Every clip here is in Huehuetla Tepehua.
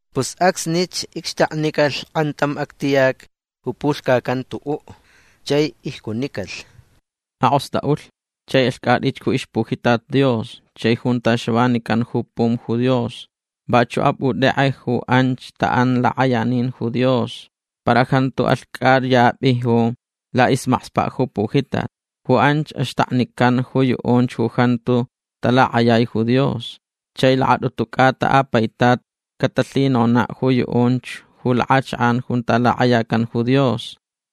Pus acsnich icxtaknicalh kʼantam actiyac ju pulhcacan tuʼuʼ. Chai icjunicalh: ―Akʼostʼaʼulh chai alhcʼatʼich ju ixpujitat Dios chai junta xavanican ju pum ju Dios. Vachuʼ apʼutʼekʼe ju anch taʼan lakʼayanin ju Dios. Para jantu alhcʼayapʼi ju laʼismakspaʼ ju pujitat. Ju anch axtaknican ju yuʼunch ju jantu talakʼayai ju Dios. Chai lakatʼutu cʼata a paitat catalhinonaʼ ju yuʼunch ju lakʼachakʼan junta lakʼayacan ju Dios.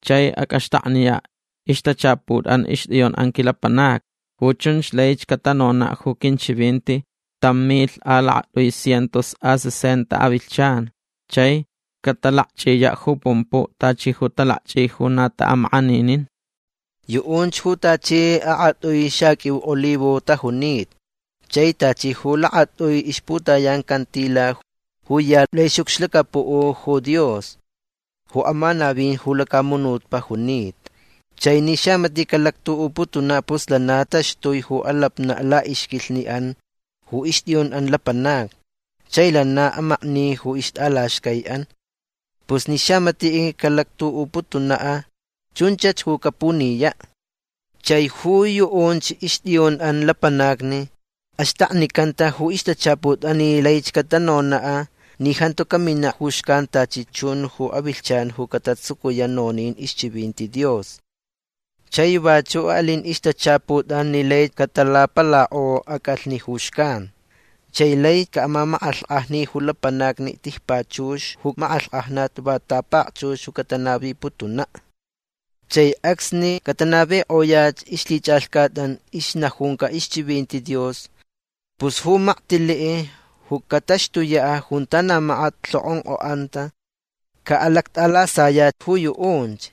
Chai acʼaxtakniyaʼ ixtachaputʼan ixtʼiyunʼan quilapanacni. Ju chunch laich catanonaʼ ju quinchivinti tam milh a lakatʼui cientos a sesenta avilhchan. Chai catalakchʼiyaʼ ju pumpuʼ tachi ju talakchʼi ju na taʼamakʼaninin. Yuʼunch ju tachi akʼatʼui xaqʼuiu olivo tajunita. Chai tachi ju lakatʼui ixputayan cantila ju ya laʼixʼucxlacapuʼ ju Dios ju amanavin ju lacamunutpaʼ junita. Chai ni xamatiʼ calactuʼuputunaʼ pus lana taxtui ju alapnaʼ laʼixquilhniʼan ju ixtʼiyunʼan lapanacni. Chai lana amakni ju ixtʼalaxcaiʼan. Pus ni xamatiʼ calactuʼuputunaʼ chunchach ju capuniyaʼ. Chai ju yuʼunch ixtʼiyunʼan lapanacni axtaknicanta ju ixtachaputʼan ni laich catanonaʼ ni jantu caminaʼ ju xcan tachi chun ju avilhchan ju catatsucuyaʼ nonin ixchivinti Dios. Chai vachuʼ alin ixtachaputʼan ni lai catalapalakʼo acʼalhni ju xcan. Chai lai caʼamamakʼalhkʼajni ju lapanacni tijpachux ju makʼalhkʼajnat va tapakchux ju catanaviputunaʼ. Chai acsni catanavikʼoyaʼ ixlhichʼalhcatʼan ixnajunca ixchivinti Dios pus ju maktiliʼ ju cataxtuyaʼ junta na makat lhokʼonkʼoʼanta caʼalactʼalasayaʼ ju yuʼunch.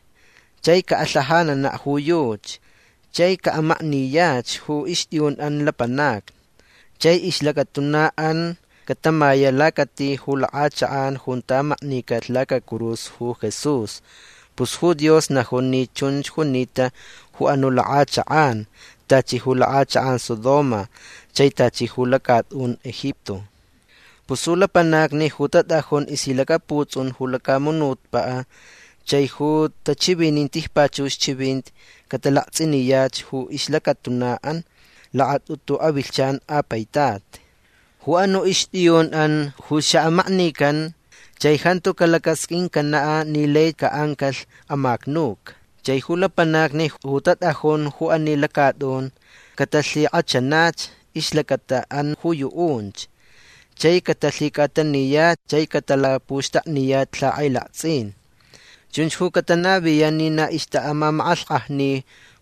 Chai calhajananaʼ ju yuchi. Chai caʼamakniyach ju ixtʼiyunʼan lapanacni. Chai ixlacatunaʼan catamayaʼ lacati ju lakʼachakʼan junta maknicalh lacacurus ju Jesús. Pus ju Dios najun ni chunch junita ju anuʼ lakʼachakʼan tachi ju lakʼachakʼan Sodoma chai tachi ju lacatʼun Egipto. Pus ju lapanacni ju tatʼajun ixlhilacaputsʼun ju lacamunutpaʼ chai ju tachivinin tijpachux chivinti catalaktsʼiniyach ju ixlacatunaʼan lakatʼutu avilhchan a paitat. Ju anuʼ ixtʼiyunʼan ju xaʼamaknican. Chai jantu calacasqʼuincanaʼ ni lai caʼancalh amacnuca. Chai ju lapanacni ju tatʼajun ju ani lacatʼun catalhikʼachanach ixlacataʼan ju yuʼunch. Chai catalhicʼataniyaʼ chai catalapuxtakniyaʼ lhakʼailaktsʼin. Chunch ju catanaviyaʼ ni na ixtaʼamamakʼalhkʼajni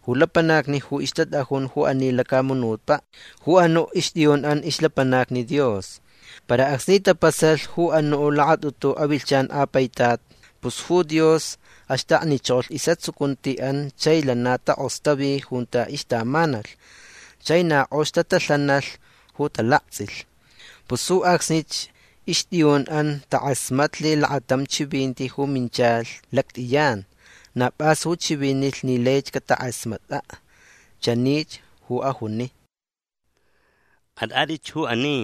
ju lapanacni ju ixtatʼajun ju ani lacamunutpaʼ ju anuʼ ixtʼiyunʼan ixlapanacni Dios. Para acsni tapasalh ju anuʼ lakatʼutu avilhchan a paitat pus ju Dios axtaknichokolh isʼatsucuntiʼan chai lana takʼostavi junta ixtamanalh. Chai na kʼox tatalhanalh ju talaktsʼilh. Pus ju acsnich ixtʼiyunʼan takʼasmatlh lakatam chivinti ju minchalh lactʼiyan. Na pʼas ju chivinilh ni laich catakʼasmatʼaʼ. Chanich ju ajuni: ―Atʼatʼitch ju ani.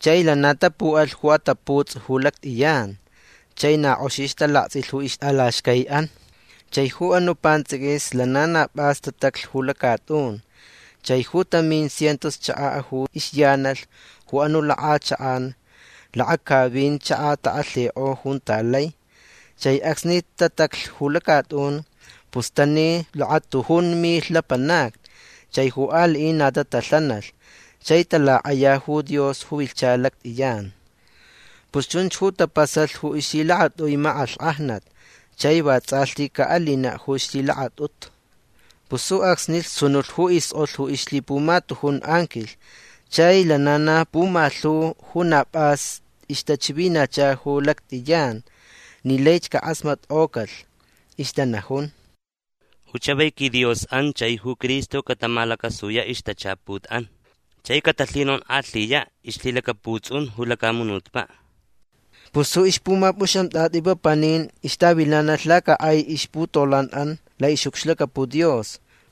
Chai lana tapuʼalh ju ataputsʼi ju lactʼiyan. Chai na kʼoxich talaktsʼilh ju ixtʼalaxcaiʼan. Chai ju anuʼ pantsʼiquis lana na pʼas tataclh ju lacatʼun. Chai ju tamin cientos chakaʼ ju ixyanalh ju anuʼ lakʼachakʼan lakacavin chakaʼ takʼalhikʼo junta lai. Chai acsni tataclh ju lacatʼun pus tani lakatujun milh lapanacni. Chai ju aliʼin na tatalhanalh chai talakʼaya ju Dios ju vilhcha lactʼiyan. Pus chunch ju tapasalh ju ixlhilakatʼui makʼalhkʼajnat chai vatsʼalhti caʼalinaʼ ju ixlhilakatʼutu. Pus ju acsnich sunulh ju iskʼolh ju ixlhipumatujun anquilh. Chai lana na pumalhu ju na pʼas ixtachivinacha ju lactʼiyan ni laich cakʼasmatkʼocalh. Ixtanajun: Ju chavai quiDiosʼan chai ju Cristo catamalacasuyaʼ ixtachaputʼan. Chai catalhinonkʼalhiyaʼ ixlhilacaputsʼun ju lacamunutpaʼ. Pus ju ixpumapʼuxamtʼatʼi papanin ixtavilanalh lacakʼai ixputolanʼan laʼixʼucxlacapuʼ Dios.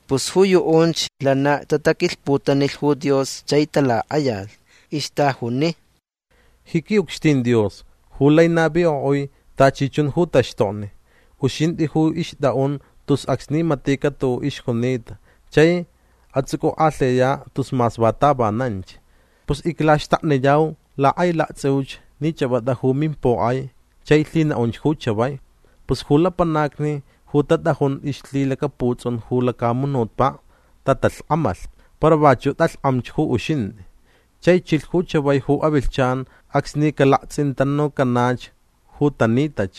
Pus ju yuʼunch lana tataquilhputanilh ju Dios chai talakʼayalh. Ixtajuni: Ji quiʼucxtin Dios ju lai navikʼoʼui tachi chun ju taxtokni uxintʼi ju ixtʼaʼun tus acsni maticaʼ tuʼuʼ ixjunita chai atsʼucʼukʼalhiyaʼ tus mas va tavananch. Pus iclaxtakniyau lakʼailaktsʼiuch ni chʼapʼatʼa ju mimpokʼai chai lhinaʼunch ju chavai. Pus ju lapanacni ju tatʼajun ixlhilacaputsʼun ju lacamunutpaʼ tatalhkʼamalh. Para vachuʼ tʼalhkʼamch ju uxintʼi. Chai chilh ju chavai ju avilhchan acsni calaktsʼintanucanach ju tanitach.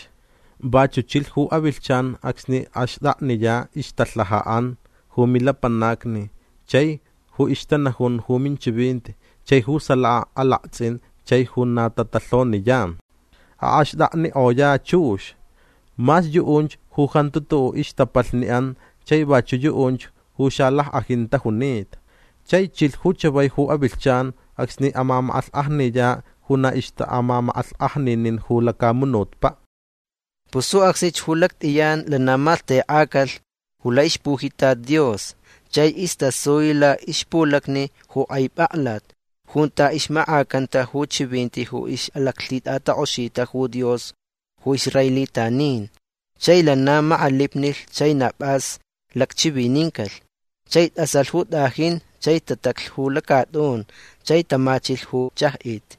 Vachuʼ chilh ju avilhchan acsni axtʼakniyaʼ ixtalhajaʼan ju milapanacni chai ju ixtanajun ju minchivinti chai ju salaka alaktsʼin chai ju na tatalhoniyan. Axtʼaknikʼoyaʼ chux. Mas yuʼunch ju jantu tuʼuʼ ixtapalhniʼan chai vachuʼ yuʼunch ju xalackʼajin tajunita. Chai chilh ju chavai ju avilhchan acsni amamakʼalhkʼajniyaʼ ju na ixtaʼamamakʼalhkʼajninin ju lacamunutpaʼ. Pus ju acsnich ju lactʼiyan lana malhtekʼacalh ju laʼixpujitat Dios chai istasui laʼixpulacni ju kʼai pʼaklat junta ixmakʼacanta ju chivinti ju ixʼalaclhitʼatakʼoxita ju Dios ju israelitanin. Chai lana makʼalipnilh. Chai na pʼas lacchivinincalh. Chai tʼasalh ju tʼajin. Chai tataclh ju lacatʼun. Chai tamachilh ju chajʼit.